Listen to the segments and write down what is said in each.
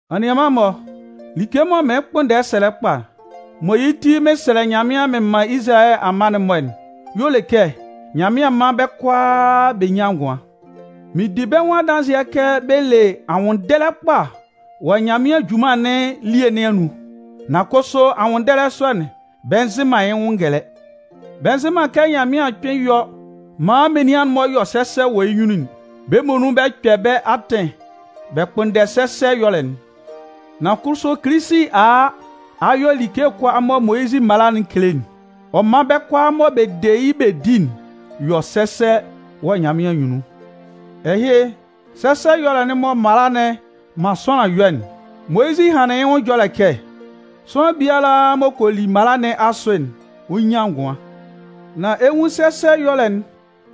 Anianman-mɔ, like mɔ mɩɩn kpʋnndɛ sɛlɛ kpa, mɔ yɩ́ ti mɩn sɛlɛ Nyanmɩan mɩn man Izalayɛ amma'n-mɔ'n y'ɔ le kɛ Nyanmɩan mán bɛ́ kʋalaa bɛ nyán ngʋan. Mɩn di bɛ́ nwʋn adanzɩɛ kɛ bɛ le anwʋnndɛlɛ kpa wɔ Nyanmɩan junman nɩn elie nɩn anun. Nan kʋsʋ anwʋnndɛlɛ sɔ'n, bɛ nzɩ man yɩ́ nwʋn ngɛlɛ. Bɛ nzɩ man kɛ Nyanmɩan kpɩn yɔ maan menian'n-mɔ yɔ sɛsɛ wɔ yɩ́ nyunnun'n. Bɛ́ muonun bɛ kpɛ bɛ́ atɩn bɛ kpʋnndɛ sɛsɛ ɛyɔlɛ'n. Nan kʋsʋ Kilisi a a ɔ'a yɔ like kʋalaa mɔ Moyizi mala'n kele'n. Ɔ man bɛ́ kʋalaa mɔ bɛ de yɩ́ bɛ di'n yɔ sɛsɛ wɔ Nyanmɩan anyunnun. Ɛhɩ sɛsɛ ɛyɔlɛ'n mɔ mala'n man sʋanlan yɔ'n, Moyizɩ hanlɩn yɩ́ nwʋn ɛjɔlɛ kɛ: Sʋanlan biala m'ɔ kɔ li mala nɩn asʋ'n, ɔ 'nyan ngʋan. Nan ɛ 'nwun sɛsɛ ɛyɔlɛ'n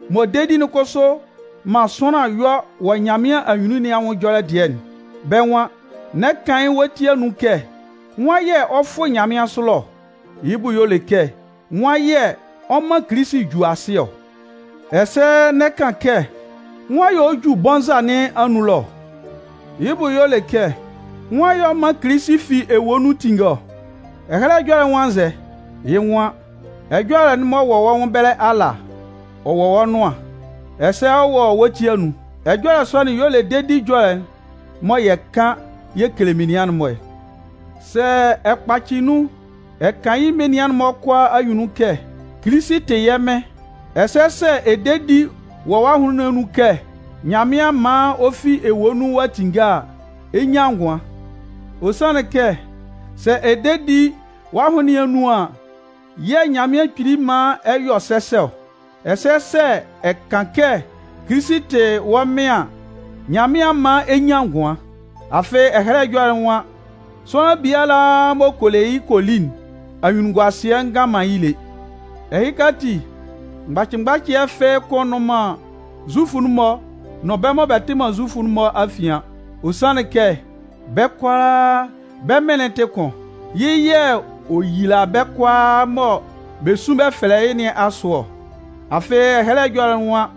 mɔ dedi'n kʋsʋ man sʋanlan yɔ wɔ Nyanmɩan anyunnun nɩn anwʋn ɛjɔlɛ dɩɛ'n. Bɛ́ nwan: N'ɛ kan yɩ́ wɔ wɔ́ ti anun kɛ: “Nwan yɛ̂ ɔ 'fʋ nyanmɩansʋ ɛlɔ ɔ?” (Yɩ́ bʋ y'ɔ le kɛ: nwan yɛ̂ ɔ 'man Kilisi ju asɩ ɔ?) Ɛsɛ n'ɛ kan kɛ: “Nwan yɛ̂ ɔ 'ju bɔnza nɩn anun ɛlɔ ɔ?” (Yɩ́ bʋ y'ɔ lɛ kɛ nwan yɛ̂ ɔ man Kilisi fi ewue nun tinnge ɔ?) Ɛhɛlɛ Ɛjɔlɛ'n nwan nzɛ? Yɩ́ nwan: Ɛjɔlɛ'n wɔ wɔ́ nwʋn ɛbɛlɛ ala, ɔ wɔ wɔ́ nʋan, ɛsɛ ɔ wɔ wɔ́ ti anun. Ɛjɔlɛ sɔ'n y'ɔ le dedi ɛjɔlɛ'n mɔ yɛ kan yɛ kele menian'n-mɔ. Sɛ ɛ kpacɩ nun ɛ kan yɩ́ menian'n-mɔ kʋalaa anyunnun kɛ: “Kilisi tɩ yɛ́ Mɩn,” ɛsɛ sɛ ɛ de di wɔ́ ahʋnlɩn nɩn anun kɛ Nyanmɩan man ɔ fi ewue nun ɔ'a tinnge a, ɛ 'nyan ngʋan. Ɔ sanlɩn kɛ sɛ ɛ de di wɔ́ ahʋnlɩn nɩn anun an yɛ̂ Nyanmɩan Kpili man ɛ yɔ sɛsɛ ɔ. Ɛsɛ sɛ ɛ kan kɛ Kilisi tɩ wɔ́ Mɩn an, Nyanmɩan 'man ɛ nyan ngʋan. Afɩ Ɛhɛlɛ Ɛjɔlɛ'n nwan: Sʋanlan biala m'ɔ kɔ le yɩ́ kɔ li'n, anyunnunguasɩɛ ngan man yɩ́ lé. Ɛhɩka ati, mgbacɩ mgbacɩɛ fɩ́ɩ́ kʋ́n nnʋn man Zufʋ'n-mɔ nʋn bɛ́ mɔ bɛ tɩ man Zufʋ nɩn afian. Ɔ sanlɩn kɛ bɛ́ kʋalaa, bɛ́ Mɩn'n tɩ kʋn. Yɩ́ yɛ̂ ɔ yila bɛ́ kʋalaa mɔ bɛ sun bɛ fɛlɛ yɩ́ nɩn asʋ ɔ. Afɩ Ɛhɛlɛ Ɛjɔlɛ'n nwan: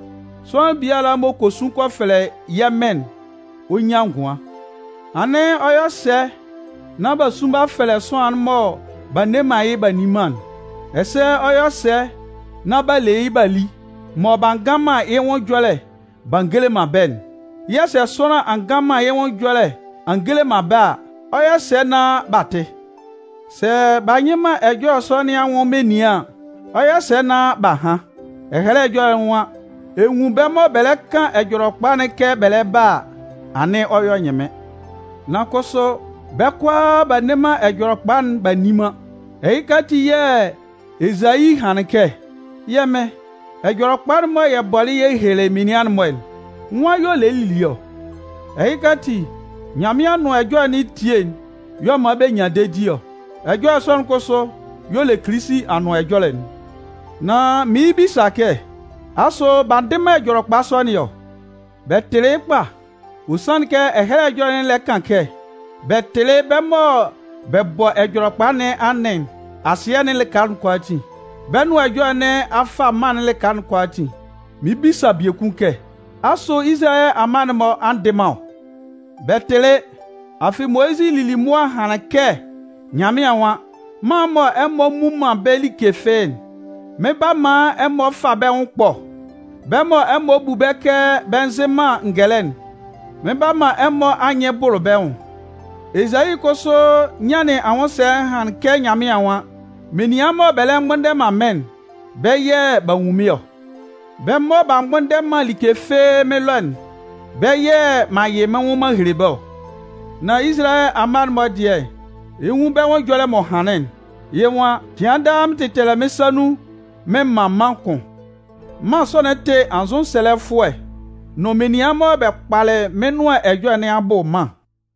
Sʋanlan biala m'ɔ kɔ sun kɔ fɛlɛ yɛ́ Mɩn'n, ɔ 'nyan ngʋan. Anɩn ɔ 'yɔ sɛ nán b'a sun b'a fɛlɛ sʋanlan'n mɔ b'a nne man yɩ́ b'a nni man'n? Ɛsɛ ɔ 'yɔ sɛ nán b'a le yɩ́ b'a li, mɔ b'a ngan man yɩ́ nwʋn ɛjɔlɛ b'a ngele man bɛ́'n? Yɛ̂ sɛ sʋanlan a ngan man yɩ́ nwʋn ɛjɔlɛ a ngele man bɛ́ a, ɔ 'yɔ sɛ nán b'a tɩ? Sɛ b'a nyɩ man ɛjɔlɛ sɔ nɩn anwʋn menian an, ɔ 'yɔ sɛ nán b'a han? Ɛhɛlɛ Ɛjɔlɛ'n nwan: Ɛ nwun bɛ́ mɔ bɛ kan Ɛjɔlɛkpa'n kɛ bɛ lɛ ba a, anɩn ɔ yɔ ɛnyɩnmɩn. Nan kʋsʋ, bɛ́ kʋalaa b'a nne man Ɛjɔlɛkpa'n b'a nni man. Ɛhɩka ati yɛ̂ Ezayi hanlɩn kɛ: Yɛ́ Mɩn, Ɛjɔlɛkpa'n mɔ yɛ bɔlɩ yɛ helelɩ menian'n-mɔ'n, nwan y'ɔ lelɩ lili ɔ? Ɛhɩka ati, Nyanmɩan Anʋan Ɛjɔlɛ nɩn etie y'ɔ man bɛ nyan dedi ɔ. Ɛjɔlɛ sɔ'n kʋsʋ y'ɔ le Kilisi Anʋan Ɛjɔlɛ'n. Nan mɩɩn bisa kɛ: “Asʋ b'a ndɩ man Ɛjɔlɛkpa sɔ nɩn ɔ?” Bɛ tɩlɩ yɩ́ kpa! Ɔ sanlɩn kɛ Ɛhɛlɛ Ɛjɔlɛ'n lɛ kan kɛ: Bɛ tɩlɩ bɛ́ mɔ bɛ bɔ Ɛjɔlɛkpa nɩn anɩn asɩɛ'n lɩka kʋalaatin. Bɛ́ nʋan ɛjɔlɛ nɩn a fa mân'n lɩka kʋalaatin. Mɩɩn bisa biekun kɛ: “Asʋ Izalayɛ amma'n-mɔ a ndɩ man ɔ?” Bɛ tɩlɩ. Afɩ Moyizɩ lili mʋa hanlɩn kɛ Nyanmɩan nwan: Mân mɔ ɛmɔ mmu man bɛ́ like fɩ́ɩ́'n, mɩn 'ba man ɛmɔ fa bɛ́ nwʋn ɛkpɔ. Bɛ́ mɔ ɛmɔ bu bɛ́ kɛ bɛ nzɩ man ngɛlɛ'n, mɩn 'ba man ɛmɔ anyɩn bʋlʋ bɛ́ nwʋn. Ezayi kʋsʋ nyanlɩn anwʋnsɛlɛ hanlɩn kɛ Nyanmɩan nwan: Menian mɔ bɛ lɛ mgbʋnndɛ man mɩ́n'n, bɛ́ yɛ̂ b'a nwun mɩ́n ɔ. Bɛ́ mɔ b'a mgbʋnndɛ man like fɩ́ɩ́ mɩ́n ɛlɔ'n, bɛ́ yɛ̂ m'an yɩ mɩ́n nwʋn m'an hele bɛ́ ɔ. Nan Izalayɛ amma'n-mɔ dɩɛ, ɛ 'nwun bɛ́ nwʋn ɛjɔlɛ m'ɔ hanlɩn'n. Yɩ́ nwan: Cɩan daa mɩn tɛtɛlɛ mɩ́n sa nun mɩn man mân kʋn. Mân sɔ'n tɩ anzʋsɛlɛfʋɛ nʋn menian mɔ bɛ kpalɩ mɩ́n nʋan ɛjɔlɛ nɩn abʋ mân.